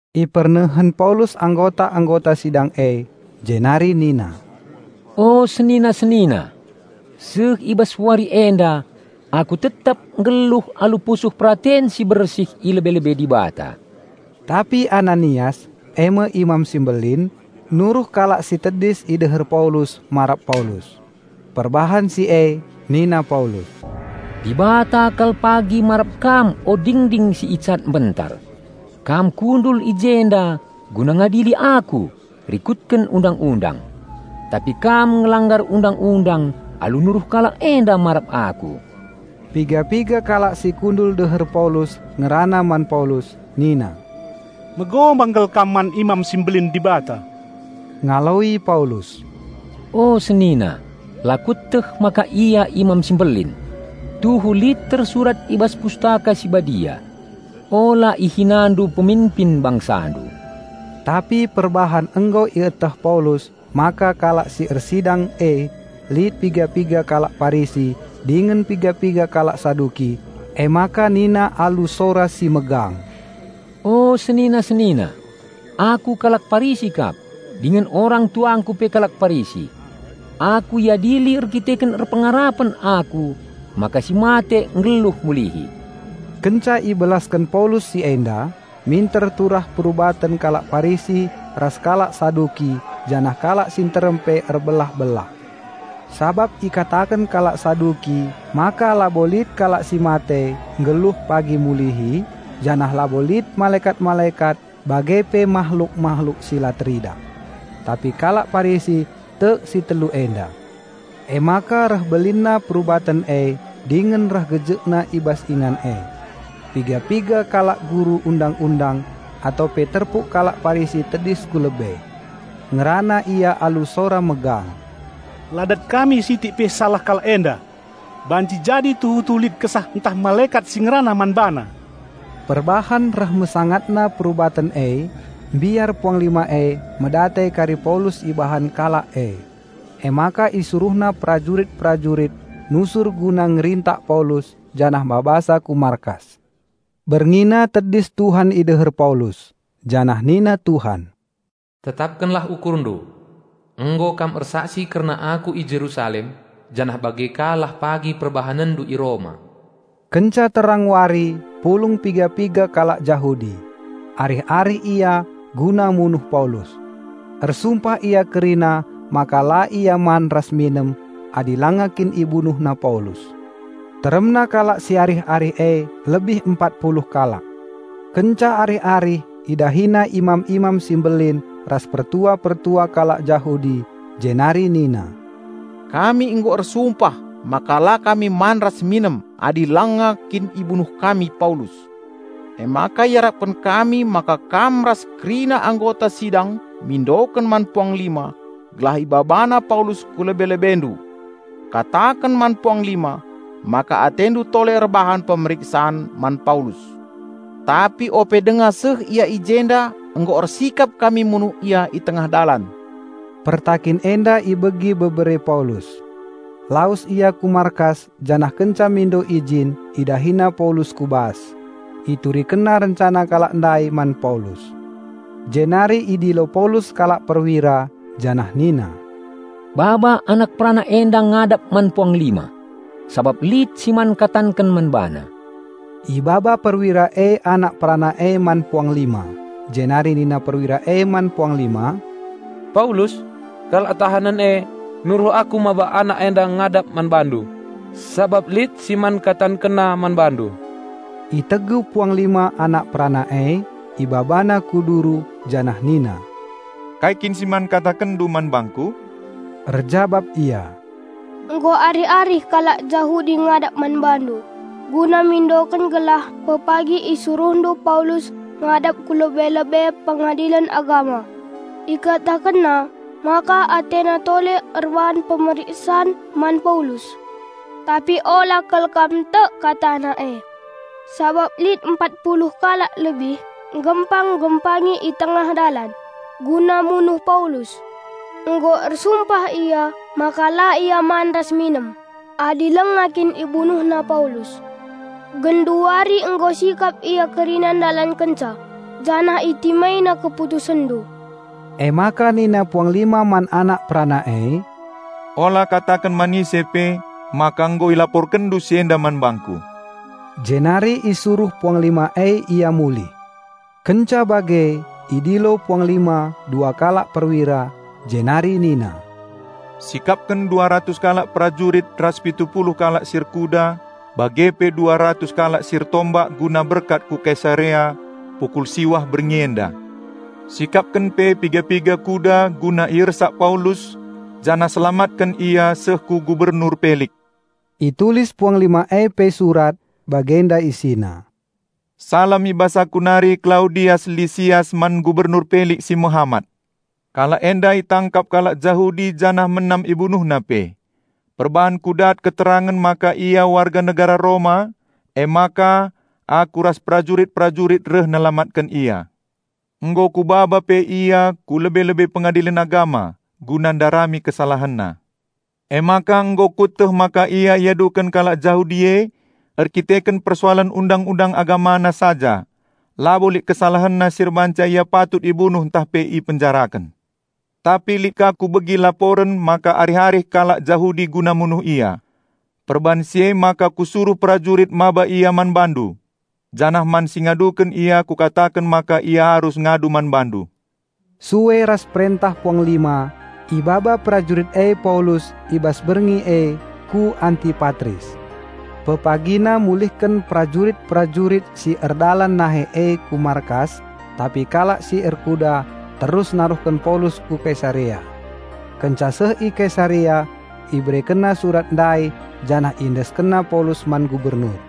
Ipernehen Paulus anggota-anggota sidang e, jenari nina, "O senina-senina! Seh i bas wari enda aku tetap nggeluh alu pusuh peraten si bersih i lebe-lebe Dibata." Tapi Ananias, eme Imam si Mbelin, nuruh kalak si tedis i deher Paulus marap Paulus. Perbahan si e nina Paulus, "Dibata kal pagi marap kam o dingding si icat mbentar! Kam kundul i jenda guna ngadili aku rikutken Undang-undang. Tapi kam ngelanggar Undang-undang alu nuruh kalak enda marap aku." Piga-piga kalak si kundul deher Paulus ngerana man Paulus, nina, "Megombang kal kam man Imam si Mbelin Dibata." Ngaloi Paulus, "O senina, la kueteh maka ia Imam si Mbelin. Tuhu lit tersurat i bas Pustaka Si Badia, 'Ula ihinandu peminpin bangsandu.'" Tapi perbahan nggo ieteh Paulus maka kalak si ersidang e lit piga-piga kalak Parisi dingen piga-piga kalak Saduki, emaka nina alu sora si megang, "O senina-senina, aku kalak Parisi kap, dingen orang-tuangku pe kalak Parisi. Aku iadili erdandanken erpengarapen aku maka si mate nggeluh mulihi!" Kenca ibelasken Paulus si enda, minter turah perubaten kalak Parisi ras kalak Saduki janah kalak si nterem pe erbelah-belah. (Sabap ikataken kalak Saduki maka labo lit kalak si mate nggeluh pagi mulihi, janah labo lit malekat-malekat bage pe mahluk-mahluk si la teridah. Tapi kalak Parisi tek si telu enda.) Emaka reh belinna perubaten e dingen reh gejekna i bas ingan e. Piga-piga kalak guru Undang-undang atau pe terpuk kalak Parisi tedis ku lebe. Ngerana ia alu sora megang, "La dat kami sitik pe salah kalak enda! Banci jadi tuhu-tuhu lit kesah ntah malekat si ngerana man bana." Perbahan reh mesangatna perubaten e mbiar puanglima e medate kari Paulus ibahan kalak e. Emaka isuruhna perajurit-perajurit nusur guna ngerintak Paulus janah mabasa ku markas. Berngina tedis Tuhan ideher Paulus, janah nina Tuhan, "Tetapkenlah ukurndu! Nggo kam ersaksi kerna Aku i Jerusalem, janah bage ka lah pagi perbahanenndu i Roma." Kenca terang wari pulung piga-piga kalak Jahudi. Arih-arih ia guna munuh Paulus. Ersumpah ia kerina maka la ia man ras minem adi langa kin ibunuhna Paulus. Teremna kalak si arih-arih e lebih empat puluh kalak. Kenca arih-arih idahina imam-imam si mbelin ras pertua-pertua kalak Jahudi jenari nina, "Kami nggo ersumpah maka la kami man ras minem adi langa kin ibunuh kami Paulus. Emaka iarapken kami maka kam ras kerina anggota sidang mindoken man puanglima gelah ibabana Paulus ku lebe-lebendu. Kataken man puanglima maka atendu tole erbahan pemeriksan man Paulus. Tapi ope denga seh ia i jenda nggo ersikap kami munuh ia i tengah dalan." Pertakin enda ibegi bebere Paulus. Lawes ia ku markas janah kenca mindo ijin, idahina Paulus ku bas. Iturikenna rencana kalak ndai man Paulus. Jenari idilo Paulus sekalak perwira, janah nina, "Baba anak perana enda ngadap man puanglima sabap lit si man katanken man bana." Ibaba perwira e anak perana e man puanglima, jenari nina perwira e man puanglima, "Paulus, kalak tahanen e, nuruh aku maba anak enda ngadap man bandu sabap lit si man katankenna man bandu." Itegu puanglima anak perana e, ibabana ku duru janah nina, "Kai kin si man katankenndu man bangku?" Erjabap ia, "Nggo arih-arih kalak Jahudi ngadap man bandu guna mindoken gelah pepagi isuruhndu Paulus ngadap ku lebe-lebe Pengadilen Agama. Ikatakenna maka atena tole erbahan pemeriksan man Paulus. Tapi ula kal kam tek katana e. Sabap lit empat puluh kalak lebih nggempang-nggempangi i tengah dalan, guna munuh Paulus. Nggo ersumpah ia maka la ia man ras minem adi langa kin ibunuhna Paulus. Genduari nggo sikap ia kerina ndalankenca, janah itimaina keputusenndu." Emaka nina puanglima man anak perana e, "Ula kataken man ise pe maka nggo ilaporkenndu si enda man bangku." Jenari isuruh puanglima e ia mulih. Kenca bage idilo puanglima dua kalak perwira, jenari nina, "Sikapken dua ratus kalak perajurit ras pitu puluh kalak si erkuda bage pe dua ratus kalak si ertombak guna berkat ku Kesarea pukul siwah berngi enda. Sikapken pe piga-piga kuda guna iersak Paulus janah selamatken ia seh ku Gubernur Pelik." Itulis puanglima e pe surat, bagenda isina, "Salam i bas aku nari Klaudias Lisias man Gubernur Pelik si mehamat. Kalak enda itangkap kalak Jahudi janah menam ibunuhna pe. Perbahan kudat keterangen maka ia warga negara Roma emaka aku ras prajurit-prajurit reh nelamatken ia. Nggo kubaba pe ia ku lebe-lebe Pengadilen Agama guna ndarami kesalahenna. Emaka nggo kueteh maka ia iaduken kalak Jahudi e erdandanken persoalen Undang-undang agamana saja. Labo lit kesalahenna si erbahanca ia patut ibunuh ntah pe ipenjaraken. Tapi lit ka kubegi laporen maka arih-arih kalak Jahudi guna munuh ia. Perbahan si emaka kusuruh perajurit maba ia man bandu. Janah man si ngaduken ia kukataken maka ia arus ngadu man bandu." Sue ras perentah puanglima, ibaba prajurit e Paulus i bas berngi e ku Antipatris. Pepagina mulihken prajurit-prajurit si erdalan nahe e ku markas tapi kalak si erkuda terus naruhken Paulus ku Kesarea. Kenca seh i Kesarea iberekenna surat ndai janah iendeskenna Paulus man Gubernur.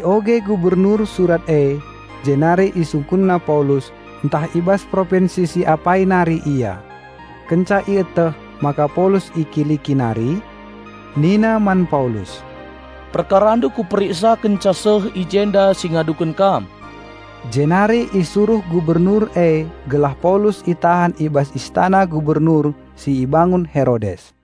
Ioge Gubernur surat e, jenari isungkunna Paulus, ntah i bas propinsi si apai nari ia. Kenca ieteh maka Paulus i Kiliki nari, nina man Paulus, "Perkarandu kuperiksa kenca seh i jenda si ngaduken kam." Jenari isuruh Gubernur e gelah Paulus itahan i bas istana Gubernur si ibangun Herodes.